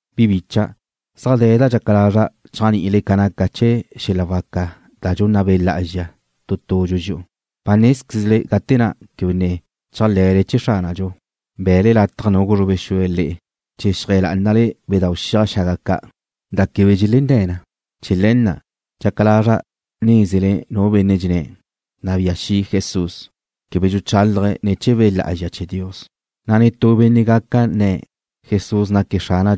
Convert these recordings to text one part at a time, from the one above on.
Bi bicha', zaj de̱ da dxaca lazra' chéajni'ile ca naca chee̱ xel-la waca ca' da dxunna Be' Lá'azxa tu tudxu dxi'u. Ba nézquezle gate na' quebe ne chéajle̱le chee̱ Xránadxu, be̱'e̱le lataj gulezrube xue̱' le'e chee̱ xeajé̱ lá'anale bedáu' xiaj xaga ca', da quebe dxelenné̱ na. Chee̱ le̱ na' dxaca lazra' nézele che zua nu benne' nne̱': Nabía xi' Jesús, quebe dxuchálaje̱' ne̱ chee̱ Be' Lá'azxa chee̱ Dios. Na' netú benne' gaca nne̱': Jesús naque̱' Xrana',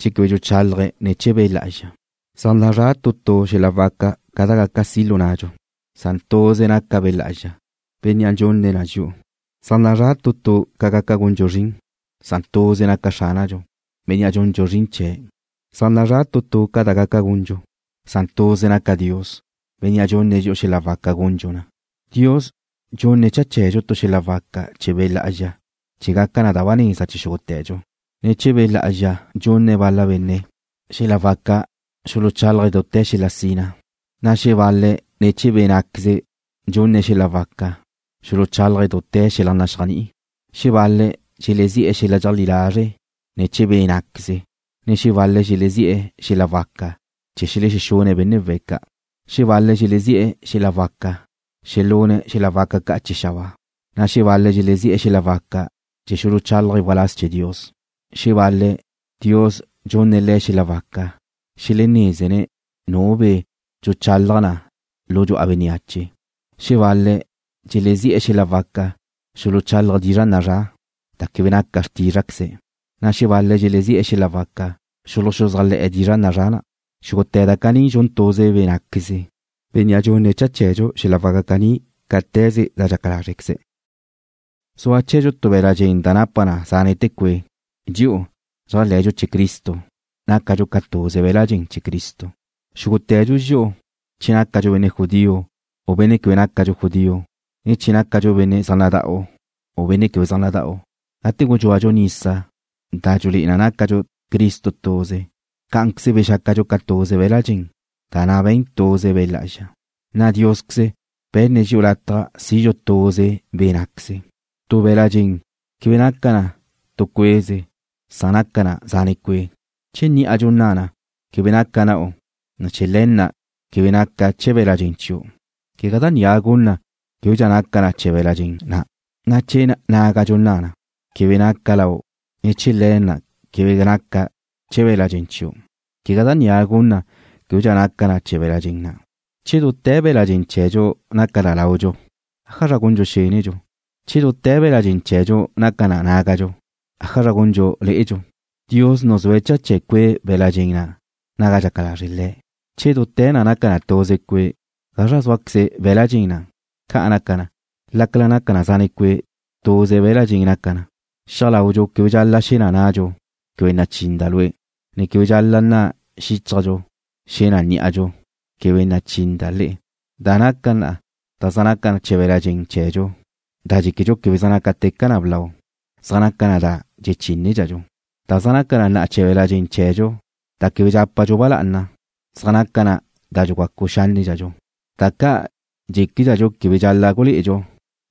che quebe dxuchálaje̱' ne̱ chee̱ Be' Lá'azxa. Zaj nazrá' xel-la waca ca' da gaca si' lu nnadxu, q san tuze naca Be' Lá'azxa, Bénnea' dxunne̱' dxi'u na. Zaj nazrá' ca gaca gundxu zrin, san tuze naca Xránadxu, Bénnea' dxundxu zrin chee̱'. Zaj nazrá' ca da gaca gundxu, san tuze naca Dios, Bénnea' dxunne̱' dxi'u xel-la waca gundxu na. Dios dxunne̱' cha chee̱dxu tu xel-la waca chee̱ Be' Lá'azxa chee̱ gaca da ba neza chee̱ xúgute̱dxu. Ne̱ chee̱ Be' Lá'azxa dxunne̱' bal-la benne' xel-la waca xuluchálaje̱' dute̱ xel-la sina, na' xebal-le̱' ne̱ chee̱ Be' ná'queze dxunne̱' le̱' xel-la waca xuluchálaje̱' dute̱ xel-la naxéajni'i. Xebal-le̱' dxelezi'e̱ xel-la dxeajlí lazre' ne̱ chee̱ Be' ná'queze, na' xebal-le̱' dxelezi'e̱ xel-la waca chee̱ xelexune̱' benne' we̱' ca'. Xebal-le̱' dxelezi'e̱ xel-la waca xelune̱' xel-la waca ca' chee̱ xabáa, na' xebal-le̱' dxelezi'e̱ xel-la waca chee̱ xuluchálaje̱' waláz chee̱ Dios. Xebal-le̱', Dios dxunne̱' le̱' xel-la waca xelenézene̱' nu be' dxuchalaj na lu dxu'a bénneache. Xebal-le̱' dxelezi'e̱ xel-la waca xuluchálaje̱' dizra' nazrá', da quebe naca xrtízrqueze̱', na' xebal-le̱' dxelezi'e̱ xel-la waca xuluxuzájle̱'e̱ dizra' nazrá' na'. Xúgute̱ da caní dxun tuze Be' ná'queze, Bénnea' dxunne̱' cha chee̱dxu xel-la waca caní cáte̱ze da dxaca lázrequeze̱'. Zua chee̱dxu tu be̱la' dxen da napa na zánete̱ cue'. Dxi'u, dxéajle̱dxu chee̱ Cristo, nácadxu ca tuze be̱la' dxen chee̱ Cristo. Xúgute̱dxu dxi'u, che nácadxu benne' judío, u benne' quebe nácadxu judío, ne che nácadxu benne' zaj nada'u, u benne' quebe zaj nada'u, gate gudxúadxu nisa da dxulé'e na nácadxu Cristo tuze, cá'anqueze bexácadxu ca tuze be̱la' dxen, da na' be̱n tuze Be' Lá'azxa, na' Diosqueze be̱nne̱' dxi'u lataj sidxu tuze Be' ná'queze. Tu be̱la' dxen quebe naca na tu cue'ze, san naca na zane' cue'. Che ní'adxu nna na: Quebe naca' na'u, ne chee̱ le̱ na' quebe naca' chee̱ be̱la' dxen chiu', quegá da ni gun na québedxa naca na chee̱ be̱la' dxen na'. Na' che nágadxu nna na: Quebe naca' lau', ne chee̱ le̱ na' quebe naca' chee̱ be̱la' dxen chiu', quegá da ni gun na québedxa naca na chee̱ be̱la' dxen na'. Che dute̱ be̱la' dxen chee̱dxu naca na laudxu, ¿ájazra gundxu xendxu? Che dute̱ be̱la' dxen chee̱dxu naca na nágadxu, ¿ájazra gundxu lé'edxu? Dios nuzúe̱' cha chee̱ cue' be̱la' dxen na' naga dxaca lazre' Le̱'. Che dute̱ na' naca na tuze cue', ¿gazra zúaqueze be̱la' dxen na'? Ca naca na, lácala naca na zane' cue', tuze be̱la' dxen naca na. Xia laudxu quebe dxal-la' xe̱ na nadxu: Quebe nachinda' lue', ne quebe dxal-la' nna xíchajdxu, xe̱ na ní'adxu: Quebe nachinda' le'e. Da naca na, da zaj naca chee̱ be̱la' dxen chee̱dxu da dxéquedxu quebe zaj nácateca na blau, zaj naca na da dxechínedxadxu, Da zaj naca na chee̱ be̱la' dxen chee̱dxu da quebe dxápadxu ba lá'ana zaj naca na da dxugacu xánnedxadxu. Da ca' dxéquedxadxu quebe dxal-la' gulé'edxu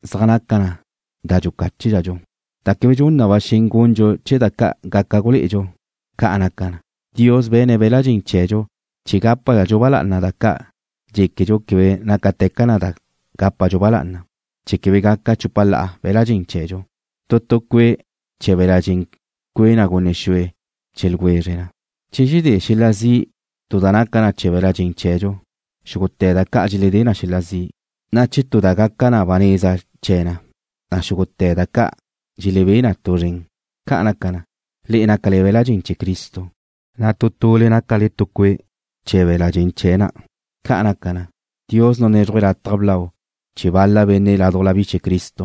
zaj naca na da dxucáchedxu, da quebe dxun na ba xen gundxu chee̱ da ca' gaca gulé'edxu. Ca' naca na, Dios be̱ne̱' be̱la' dxen chee̱dxu chee̱ gápadxadxu ba lá'ana da ca' dxéquedxu quebe nácateca na da gápadxu ba lá'ana, chee̱ quebe gaca chupa la'a be̱la' dxen chee̱dxu. Tu tu cue' chee̱ be̱la' dxen cue' na gunne xue chee̱ ljwezre na. Che dxedé xel-la zi' tu da naca na chee̱ be̱la' dxen chee̱dxu, xúgute̱ da ca' dxeledé na xel-la zi', na' che tu da na' gaca da ba neza chee̱ na, na' xúgute̱ da ca' dxelebé na tu zren. Ca' naca na, le'e nácale be̱la' dxen chee̱ Cristo, na' tu tule nácale ca tu tu cue' chee̱ be̱la' dxen chee̱' na'. Ca' naca na, Dios nunézruje̱' lataj blau chee̱ bal-la benne' ládujla bi chee̱ Cristo.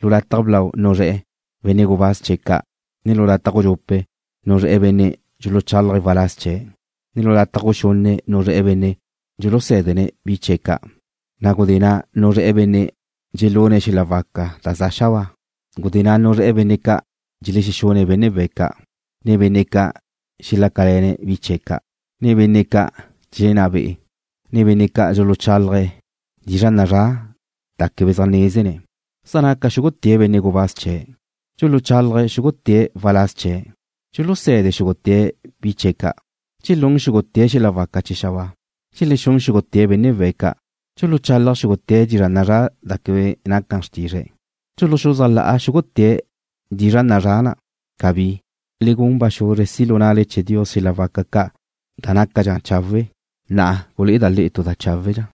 Lu lataj blau nuzré̱'e̱ benne' gubáz chee̱' ca', na' lu lataj gudxupe' nuzré̱'e̱ benne' dxuluchálaje̱' waláz chee̱', na' lu lataj guxunne' nuzré̱'e̱ benne' dxulusé̱dene̱' bi chee̱' ca', na' gudé na' nuzré̱'e̱ benne' dxelune̱' xel-la waca da za xabáa. Gudé na' nuzré̱'e̱ benne' ca' dxelexune̱' benne' we̱' ca', ne benne' ca' dxelácale̱ne̱' bi chee̱' ca', ne benne' ca' dxelenná be'e̱, ne benne' ca' dxuluchálaje̱' dizra' nazrá' da quebe zaj nézene̱'. ¿Zaj naca xúgute̱' benne' gubáz chee̱'? ¿Dxuluchalaj xúgute̱' waláz chee̱'? ¿Dxuluse̱de xúgute̱' bi chee̱' ca'? ¿Dxelún xúgute̱' xel-la waca chee̱ xabáa? ¿Dxelexún xúgute̱' benne' we̱' ca'? ¿Dxuluchalaj xúgute̱' dizra' nazrá' da quebe naca xrtizre̱'? ¿Dxuluxuzájla'a xúgute̱' dizra' nazrá' na'? ¡Cabí! Le gun ba xuzre si' lu na'le chee̱ Dios xel-la waca ca' da nácadxa chawe'. Na'a gulé'eda' le'e tu da cháwedxa.